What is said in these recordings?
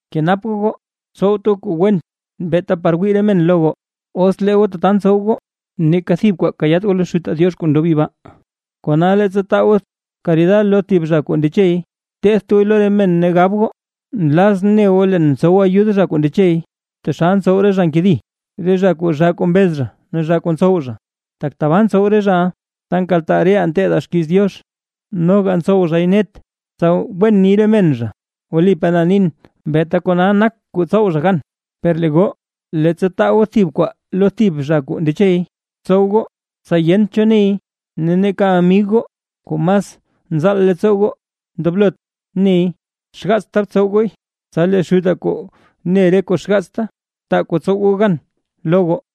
’Kenap goo goo, tsowt goo kuu wen beeta par wii re men lo goo; os lee goo tata ntsow goo, neeka thib kwaa kayaat goo lo Xutaa Diox kuu ndob yibaa. ’Kona leettsa taa goo karida lo thib zha kuu ndechey, tetht gooy lo re men ne gab goo: “Nlazʼn ne goo leen mtsow ayud zha kuu ndechey”, taxal ntsow re zha kuu nkedi, re zha kuu zhaa kuu mbez ne zhaa kuu ntsow. Tak tabaa ntsow re zhaʼa, ta nkaltaa reʼaa nteedaa xkiiz Diox, noga ntsow zhay net, tsa wen ni re men zha. Wlipaa na nin, beeta kona nak kuu tsow zha gan. Per lee goo, leettsa taa goo thib kwaa lo thib zha kuu ndechey, btsow goo tsa yent cho ney, ne neeka amig goo kuu mas nzaal leettsoo goo ndoblot ney. Xgaatsa btsow gooy, tsa lee Xutaa kuu ne re kuu xgaatsta, taa kuu tsow goo gan lo goo.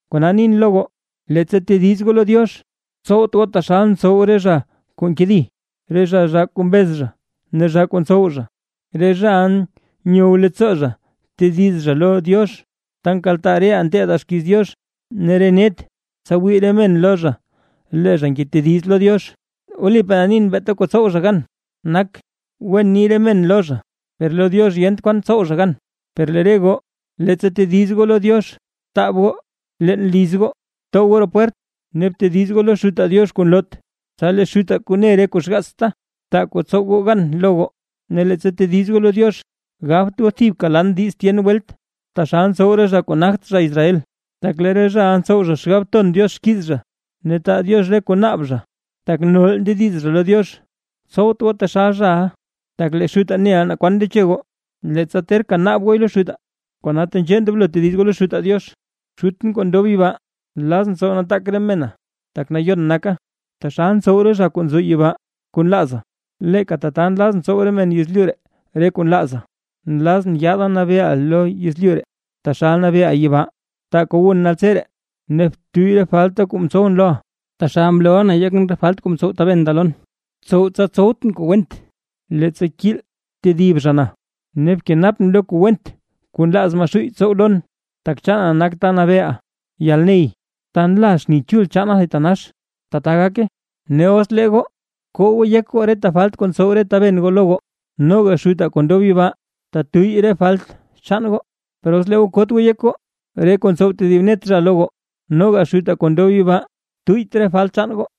’Kona nin lo goo, leettsa tediz goo lo Diox, tsowt goo taxal ntsow re zha kuu nkedi, re zha kuu zhaa kuu mbez ne zhaa kuu ntsow zha. Re zhaʼa nyow leettsoo zha tediz zha lo Diox, ta nkaltaa reʼaa nteedaa xkiiz Diox ne re net, tsa wii re men lo zha lee zha ngetediz lo Diox. Wlipaa na nin, beeta kuu tsow zha gan nak, wen ni re men lo zha, per lo Diox yent kwan tsow zha gan. Per lee re goo, leettsa tediz goo lo Diox, btaab goo leen liz goo, btow goo roo pwert, ne btediz goo lo Xutaa Diox kuu nloot, tsa lee Xutaa kuu ne re kuu xgaats, taa kuu tsow goo gan lo goo. ’Ne leettsa tediz goo lo Diox, gabt goo thibka lan diiz tyen welt, taxal ntsow re zha kuu nagt zha Israel. Tak lee re zhaʼa ntsow zha xgab ton Diox xkiiz zha, ne taa Diox re kuu naab zha, tak nol ndediz zha lo Diox. Tsowt goo taxal ntsow re zhaʼa; tak lee Xutaa neʼa naa kwan ndeche goo, leettsa terka naab gooy lo Xutaa. Kona, tenzhee ndoblo tediz goo lo Xutaa Diox: Xutʼn, kuu ndob yibaa, nlazʼn tsow nataak re mena tak nayon naka. Taxal ntsow re zha kuu nzo yibaa kuu nlaaza, leeka tata nlazʼn tsow re men yezlyu ree kuu nlaaza. Nlazʼn yaada nabeeʼa lo yezlyu ree, taxal nabeeʼa yibaa. Taa kuu wun naltseree. Ne btuyy re falta kuu mtsowʼn loʼa, taxal mloʼa na yekʼn re falt kuu mtsow re taben da lon. Btsow tsa tsowtʼn kuu went, leettsa nkiil tedib zha na, ne bkenapʼn lo kuu went kuu nlaaz Maxuuy tsow lon, tak chaana nak ta nabeeʼa, yalney ne ta nla xni chul chaana thitanax. Tata gake. ’Ne os lee goo, koo goo yek goo reta falt kuu mtsow re taben goo lo goo, noga Xutaa kuu ndob yibaa tetuyy re falt chaan goo. Per os lee goo koot goo yek goo re kuu mtsow tedib net zha lo goo, noga Xutaa kuu ndob yibaa, tuyyt re falt chaan goo.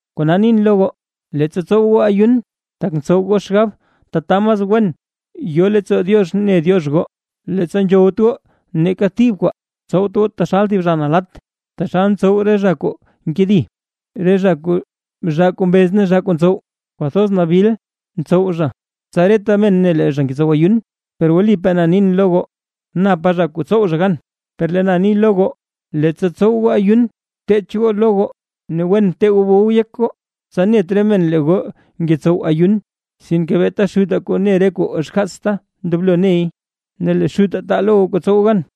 ’Kona nin lo goo, leettsa tsow goo ayun, tak ntsow goo xgab tata mas wen nzo leettsoo Diox ne Diox goo, leettsa nzhowt goo neeka thib kwaa, tsowt goo taxal thib zha nalatt, taxal ntsow re zha kuu nkedi, re zha kuu zhaa kuu mbez ne zhaa kuu ntsow. Kwathoz nabil ntsow zha, tsa reta men ne lee zha ngetsow ayun. Per wlipaa na nin lo goo, napa zha kuu tsow zha gan. Per lee na ni lo goo, leettsa tsow goo ayun, bteech goo lo goo ne wen btee goo bow yek goo, tsa net re men lee goo ngetsow ayun. Sinke beeta Xutaa kuu ne re kuu xgaats ndoblo ney, ne lee Xutaa taa lo goo, kuu tsow goo gan.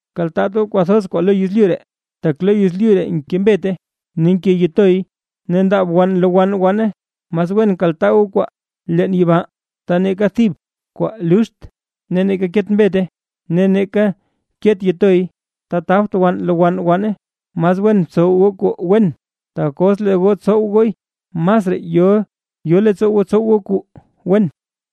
’Kaltaat goo kwathoz kwaa lo yezlyu ree, tak lo yezlyu ree nke mbete ne nke yitoy, ne ndaab wann nlowann wann. Mas wen kaltaa goo kwaa leen yibaa, ta neeka thib kwaa luxt ne neeka ket mbete, ne neeka ket yitoy, ta tabt wann lowann wann. Mas wen btsow goo kuu wen, tak os lee goo tsow gooy, masraa yo leettsoo goo tsow goo kuu wen.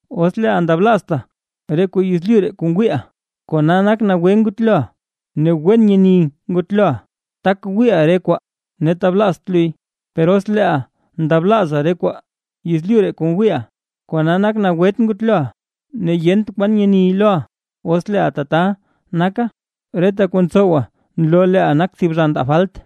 ’Os leeʼa ndablaazta re kuu yezlyu ree kuu ngwiiʼa, kona nak nagwe ngutloʼa ne wen nyeni ngutloʼa, tak wiiʼa re kwaa ne tablaazt luy. Per os leeʼa ndablaaza re kwaa yezlyu ree, kuu ngwiiʼa, kona nak taxal nagwet ngutloʼa ne yent kwan nyeni loʼa. Os leeʼa tata naka, reta kuu ntsowa nloo leeʼa nak thib zha ndaa falt.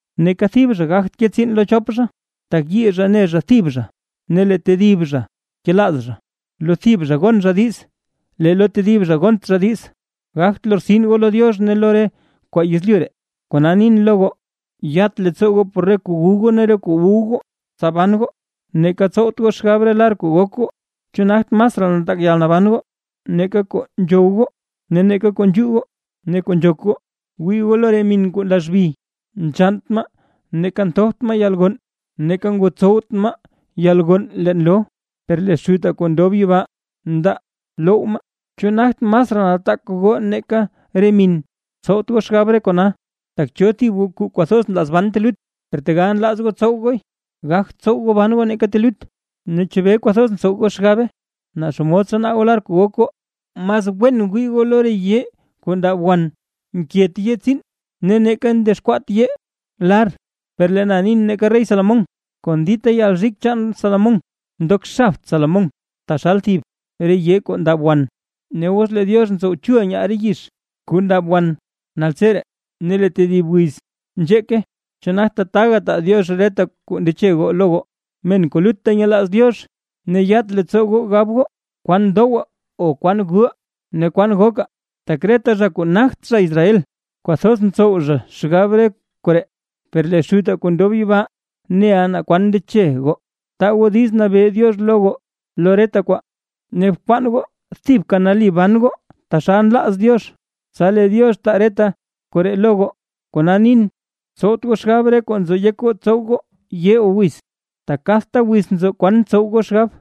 ’Neeka thib zha gagt ke tsiin lo chop zha, tak teyii zha ne thib zha, ne lee tedib zha kelaaz zha, lo thib zha gon zha diiz, lee lo tedib zha gont zha diiz. Gagt lortsin goo lo Diox ne lo re kwaa yezlyu ree. ’Kona nin lo goo: Yat leettsoo goo por re kuu wu goo ne kuu gu goo, tsa ban goo, neeka tsowt goo xgab re lar kuu gok goo. ¿Chu nagt masraa nataak yalnaban goo, nake kuu nzhow goo, kuu nzhuu goo ne kuu nzhok goo? Wii goo lo re min kuu nlazbi, nzhannt maa, neeka nthopt maa yalgonn, neeka ngotsowt maa yalgonn leen loo, per lee Xutaa kuu ndob yibaa ndaa loww maa. ¡Chu nagt masraa nataak goo nake re min! Tsowt goo xgab re kona, tak ¿cho thib goo kuu kwathoz nlaaz ban telut, per tegal nlaaz gooy, gagt tsow goo ban goo neeka telut? ’¿Ne chebee kwathoz ntsow goo xgab, naa xomod tsanaa goo lar kuu gok goo? Mas wen wii goo lo re yee kuu ndab wan; nket yee tsiin ne neeka ndexkwaat yee lar. Per lee na ni neeka rey Salomón, kon dita yalrik chaan Salomón mdogt xab Salomón taxal thib re yee kuu ndab wan. Ne os lee Diox ntsow chul nyaal re yizh kuu ndab wan naltseree, ne lee tedib wiz nzheeke, ¿chu nagt tataga taa Diox reta kuu ndeche goo lo goo, men kuu lutta nyelaaz Diox? Ne yat leettsoo goo gab goo: “¿Kwan dowaa o kwan guʼaa ne kwan gokaa?” Tak reta zha kuu nagt zha Israel, kwathoz ntsow zha xgab re koree. Per lee Xutaa kuu ndob yibaa neʼa naa kwan ndeche goo. Taa goo diiz nabee Diox lo goo lo reta kwaa, ne bkwaan goo thibka nali ban goo taxal nlaaz Diox, tsa lee Diox taa reta koree lo goo. Kona nin, tsowt goo xgab re kuu nzo yek goo tsow goo yee o wiz, tak kadta wiz nzo kwan tsow goo xgab.